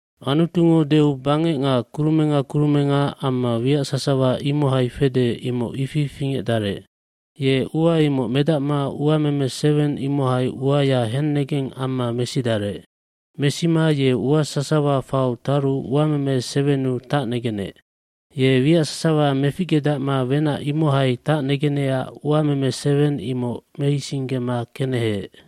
Anutungo deu bangec nga kurumenga kurumenga amma wiac sasawa imohai fede imoc ifi fingecdarec. aFingecdaru uameme seweng anec. Uameme seweng ammanu ua sasawa fau taru tacnegenec. Ye wiac sasawa meficgedacma wenac imohai tacnegenecac uameme seweng imoc meisinggema keneheec.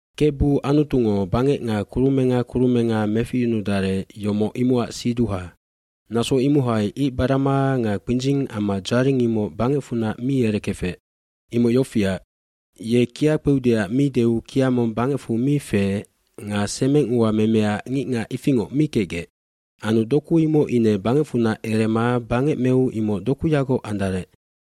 Kebu Anutungo bangec nga kurumenga kurumenga meficyunudarec, yomoc imocac siduha. Naso imohai icbarama nga kpindzing amma dzaring imoc bangecfunac mi erekefec. Imoc yofiac, ye kia kpeudeac mi deu kia mong bangecfu mi feec nga semeng ua memeac ngicngac ifingoc mi kecgec. Anu doku imoc ine bangecfunac erema bangec meu imoc dokuyagoc andarec.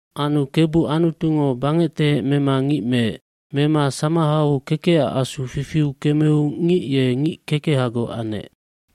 bAnu Kebu Anutungo bangectehec mema ngic meec. Mema samahau kekecac asu fifiu kemeu ngic ye ngic kekehagoc anec.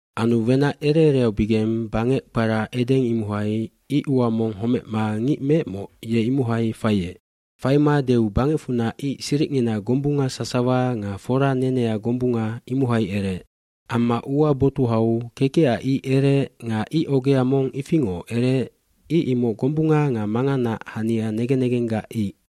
Anu wenac ere ereaubigeng bangec kpara Eden imohai ic ua mong homecma ngic meecmoc ye imohai faiec. cFaima deu bangecfunac ic siricngina gombunga sasawa nga fora nenea gombunga imohai ereec. Amma ua botuhau kekecac ic ereec nga ic ogea mong ifingoc ereec ic imoc gombunga nga manganaac hania negen negenggac ic.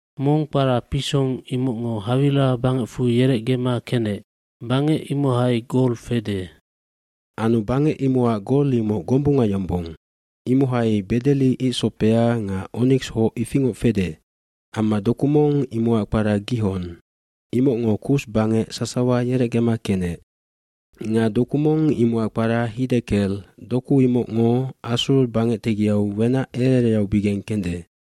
Mong kpara Pison imocngo Hawila bangecfu yerecgema kenec. Bangec imohai gol fede. Anu bangec imocac gol imoc gombunga yombong. Imohai bedeli icsopead nga oniks hoce ifingoc fede. Amma doku mong imocac kpara Gihon. Imocngo Kus bangec sasawa yerecgema kenec. Nga doku mong imocac kpara Hiddekelf Doku imocngo Assur bangec tegiau wenac ere ereaubigeng kende.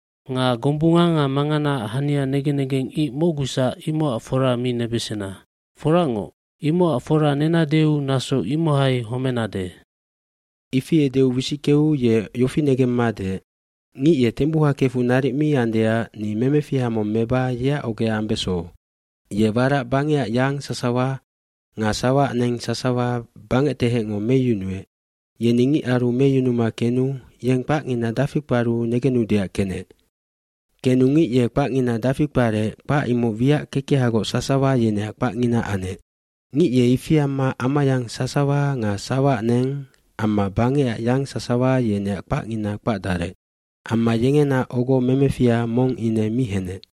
hNga gombunga nga manganaac hania negen negeng ic mocgusac imocac fora mi nebesena. Foracngoc, imocac fora nenadeu naso imohai homenade.” iIfi edeu wisickeu ye yofi negemma deec, “Ngic ye tembuha kefu naric mi andeac ni memefiha mong meba yeac ogea ambeso.” Ye warac bangecac yang sasawa nga sawaac neng sasawa bangectehecngo meyunuec yeni ngicaru meyunuma kenu yeng kpacngina dafi kparu negenudeac kenec. Kenu ngic ye kpacngina dafi kparec kpac imoc wiac kekehagoc sasawa yeneac kpacngina anec. Ngic ye ifi amma amayang sasawa nga sawaac neng amma bangecac yang sasawa yeneac kpacngina kpacdarec. Amma yengena ogo memefiha mong ine mi henec.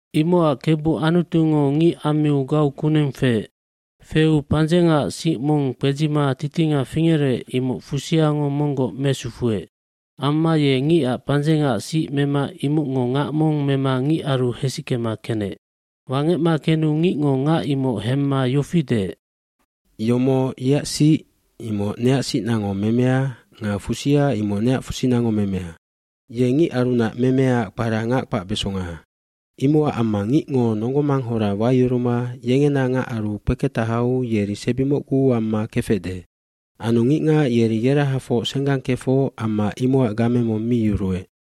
Imocac Kebu Anutungo ngic ammiu gau kuneng feec. Feupandzengaac sic mong kpedzima titinga fingerec imoc fusiangomonggoc mesufuec. Amma ye ngicac pandzengaac sic memaimocngo ngac mong mema ngicaru hesickema kenec. Wangecmakenu ngicngo ngac imoc hemma yofi deec, “Yomoc yeac sic imocneac sicnango memea nga fusia imoc neac fusinango memea. Yengicarunac memeaac kpara ngac g kpacbesonga.” Imocac ammangicngo nonggomanghora wayuruma yengena ngacaru kpeketahauyeri sebi mocgu amma kefecde. Anu ngicngac yeri yerahafocsenggang kefoc amma imocac game mong mi yuruec.